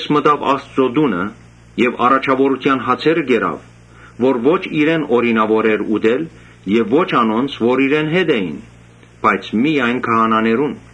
Մտաւ Աստուծոյ տունը եւ առաջաւորութեան հացերը կերաւ, որ ո՛չ իրեն օրինաւոր էր ուտել եւ ո՛չ անոնց որ իրեն հետ էին, բայց միայն քահանաներուն։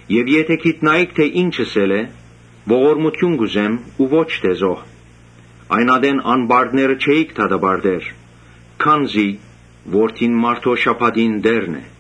Եթէ գիտնայիք թէ ի՛նչ ըսել է ‘Ողորմութիւն կ’ուզեմ ու ո՛չ թէ զոհ’, այն ատեն անպարտները չէիք դատապարտեր. Քանզի Որդին մարդոյ Ոմանք, շաբաթին ալշաբաթին տէրն է»։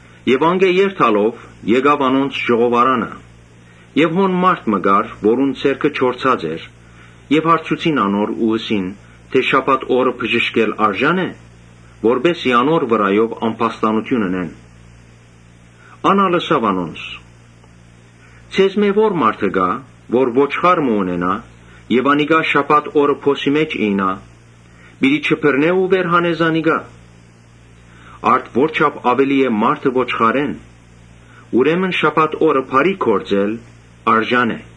Անկէ երթալով՝ գնաց անոնց ժողովարանը։ Հոն մարդ մը կար, որուն ձեռքը չորցած էր։ Հարցուցին անոր. «Շաբաթ օրը բժշկել արժա՞ն է», որպէս զի անոր վրայով ամբաստանութիւն ընեն։ Ան ալ ըսաւ անոնց. «Ձեզմէ ո՞ր մարդը կայ, որ ոչխար մը ունենայ եւ անիկա շաբաթ օրը փոսի մէջ իյնայ, չի բռներ ու վեր հաներ զանիկա։ Արդ՝ ո՜րչափ աւելի է մարդը ոչխարէն։ Ուրեմն շաբաթ օրը բարի գործել արժան է»։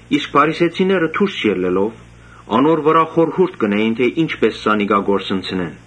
Իսկ փարիսեցիները դուրս ելլելով՝ անոր վրայով խորհուրդ կ’ընէին թէ ի՞նչպէս զանիկա կորսնցնեն։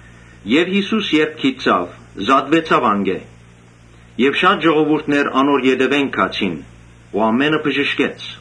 Յիսուս երբ գիտցաւ, դատուեցաւ անկէ եւ շատ ժողովուրդ անոր ետեւէն գացին ու ամէնքը բժշկեց,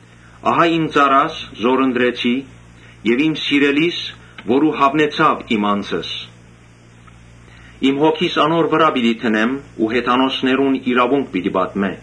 «Ահա իմ ծառաս, զոր ընտրեցի եւ իմ սիրելիս, որուն հաւնեցաւ իմ անձս. իմ Հոգիս անոր վրայ պիտի դնեմ ու հեթանոսներուն իրաւունք պիտի տայ։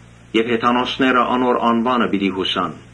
Եւ հեթանոսները անոր անունը պիտի յուսան»։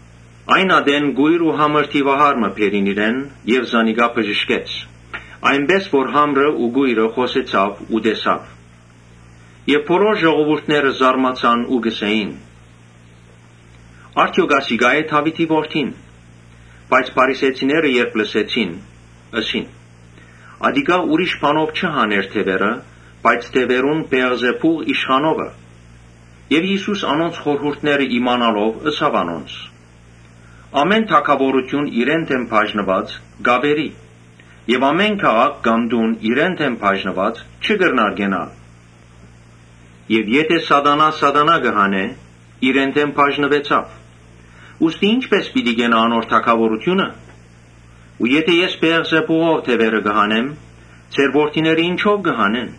Այն ատեն կոյր ու համր դիւահար մը բերին իրեն եւ զանիկա բժշկեց, այնպէս որ համր ու կոյրը խօսեցաւ ու տեսաւ։ Բոլոր ժողովուրդը զարմացած կ’ըսէին. «Արդեօք ասիկա՞ է Դաւիթին որդին»։ Բայց փարիսեցիները երբ լսեցին՝ ըսին. «Ատիկա ուրիշ բանով չի հաներ դեւերը, բայց դեւերուն Բէեղզեբուղ իշխանովը»։ Յիսուս անոնց խորհուրդները իմանալով ըսաւ անոնց. «Ամէն թագաւորութիւն իրեն մէջ բաժնուած կ’աւերի. եւ ամէն քաղաք կամ տուն իրեն դէմ բաժնուած՝ չի կրնար կենալ։ Եթէ Սատանան Սատանայ հանէ, իրեն դէմ բաժնուեցաւ. ուստի ի՞նչպէս պիտի կենայ անոր թագաւորութիւնը։ Ու եթէ ես Բէեղզեբուղով դեւերը կը հանեմ, ձեր որդիները ինչո՞վ կը հանեն.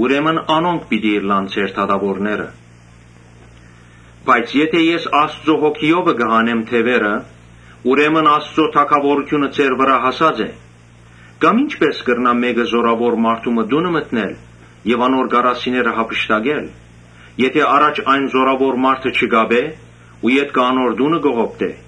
ուրեմն անոնք պիտի ըլլան ձեր դատաւորները։ Բայց եթէ ես Աստուծոյ Հոգիովը կը հանեմ դեւերը, ուրեմն Աստուծոյ թագաւորութիւնը ձեր վրայ հասած է։ Կամ ի՞նչպէս կրնայ մէկը զօրաւոր մարդու մը տունը մտնել եւ անոր կարասիները յափշտակել, եթէ առաջ այն զօրաւոր մարդը չկապէ ու ետքը անոր տունը կողոպտէ։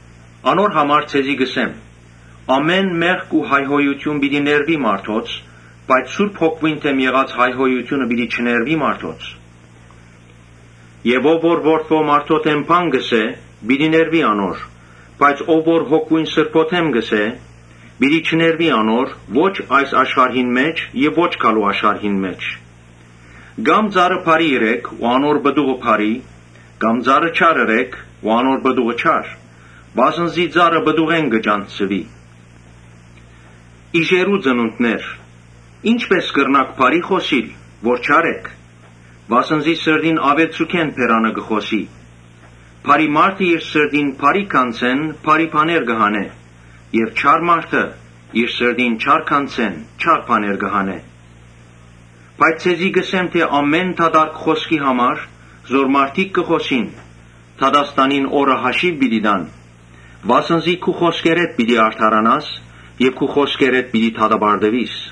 Անոր համար ձեզի կ’ըսեմ. ‘Ամէն մեղք ու հայհոյութիւն պիտի ներուի մարդոց, բայց Սուրբ Հոգիին դէմ եղած հայհոյութիւնը պիտի չներուի մարդոց’։ Ով որ Որդի մարդոյ դէմ բան ըսէ, պիտի ներուի անոր, բայց ով որ Սուրբ Հոգիին դէմ ըսէ, պիտի չներուի անոր, ո՛չ այս աշխարհին մէջ եւ ոչ գալու աշխարհին մէջ։ Կամ ծառը բարի ըրէք ու անոր պտուղը բարի, կա՛մ ծառը չար ըրէք ու անոր պտուղը չար. վասն զի ծառը պտուղէն կը ճանչցուի։ Իժերո՛ւ ծնունդներ, ի՞նչպէս կրնաք բարի խօսիլ, որ չար էք. վասն զի բերանը սրտին աւելցուքէն կը խօսի։ Բարի մարդը իր սրտին բարի գանձէն բարի բաներ կը հանէ եւ չար մարդը իր սրտին չար գանձէն չար բաներ կը հանէ։ Բայց ձեզի կ’ըսեմ թէ ‘Ամէն դատարկ խօսքի համար՝ զոր մարդիկ կը խօսին, դատաստանին օրը հաշիւ պիտի տան’։ Վասն զի քու խօսքերէդ պիտի արդարանաս եւ քու խօսքերէդ պիտի դատապարտուիս»։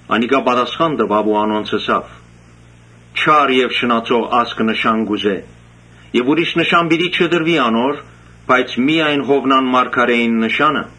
Անիկա պատասխան տուաւ ու անոնց ըսաւ. «Չար եւ շնացող ազգը նշան կ’ուզէ։ Ուրիշ նշան պիտի չտրուի անոր, բայց միայն Յովնան մարգարէին նշանը։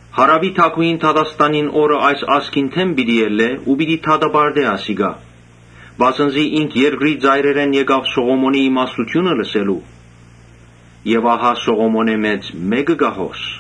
Հարաւի թագուհին դատաստանին օրը այս ազգին դէմ պիտի ելլէ ու պիտի դատապարտէ ասիկա, վասն զի ինք երկրի ծայրերէն եկաւ Սողոմոնին իմաստութիւնը լսելու. եւ ահա Սողոմոնէն մեծ մէկը կայ հոս»։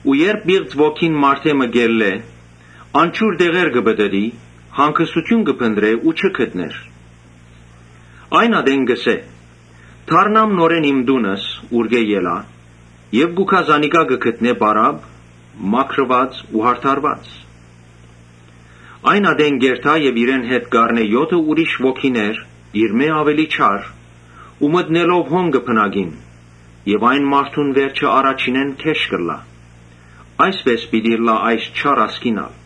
«Երբ պիղծ ոգին մարդէ մը ելլէ, անջուր տեղերը պտըտի՝ հանգստութիւն փնտռէ ու չգտնէ. Այն ատեն կ’ըսէ. ‘Դառնամ նորէն իմ տունս, ուրկէ ելայ’։ Կու գայ զանիկա կը գտնէ պարապ, մաքրուած ու յարդարուած։ Այն ատեն կ’երթայ եւ իրեն հետ կ’առնէ եօթը ուրիշ ոգիներ իրմէ աւելի չար ու մտնելով հոն կը բնակին։ Այն մարդուն վերջը առաջինէն գէշ կ’ըլլայ։ Այսպէս պիտի ըլլայ այս չար ազգին ալ»։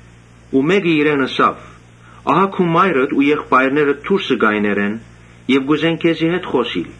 Մէկը իրեն ըսաւ. «Ահա քու մայրդ ու եղբայրներդ դուրսը կայներ են եւ կ՛ուզեն քեզի հետ խօսիլ»։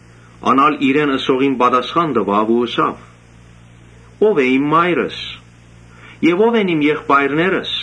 Ան ալ իրեն ըսողին պատասխան տուաւ ու ըսաւ. «Ո՞վ է իմ մայրս եւ որո՞նք են իմ եղբայրներս»։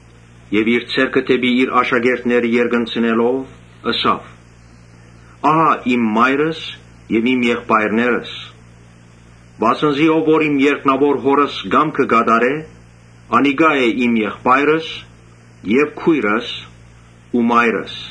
Եւ իր ձեռքը դէպի իր աշակերտները երկնցնելով՝ ըսաւ. «Ահա իմ մայրս եւ իմ եղբայրներս. Վասն զի ով որ իմ երկնաւոր Հօրս կամքը կը կատարէ, անիկա է իմ եղբայրս եւ քոյրս ու մայրս»։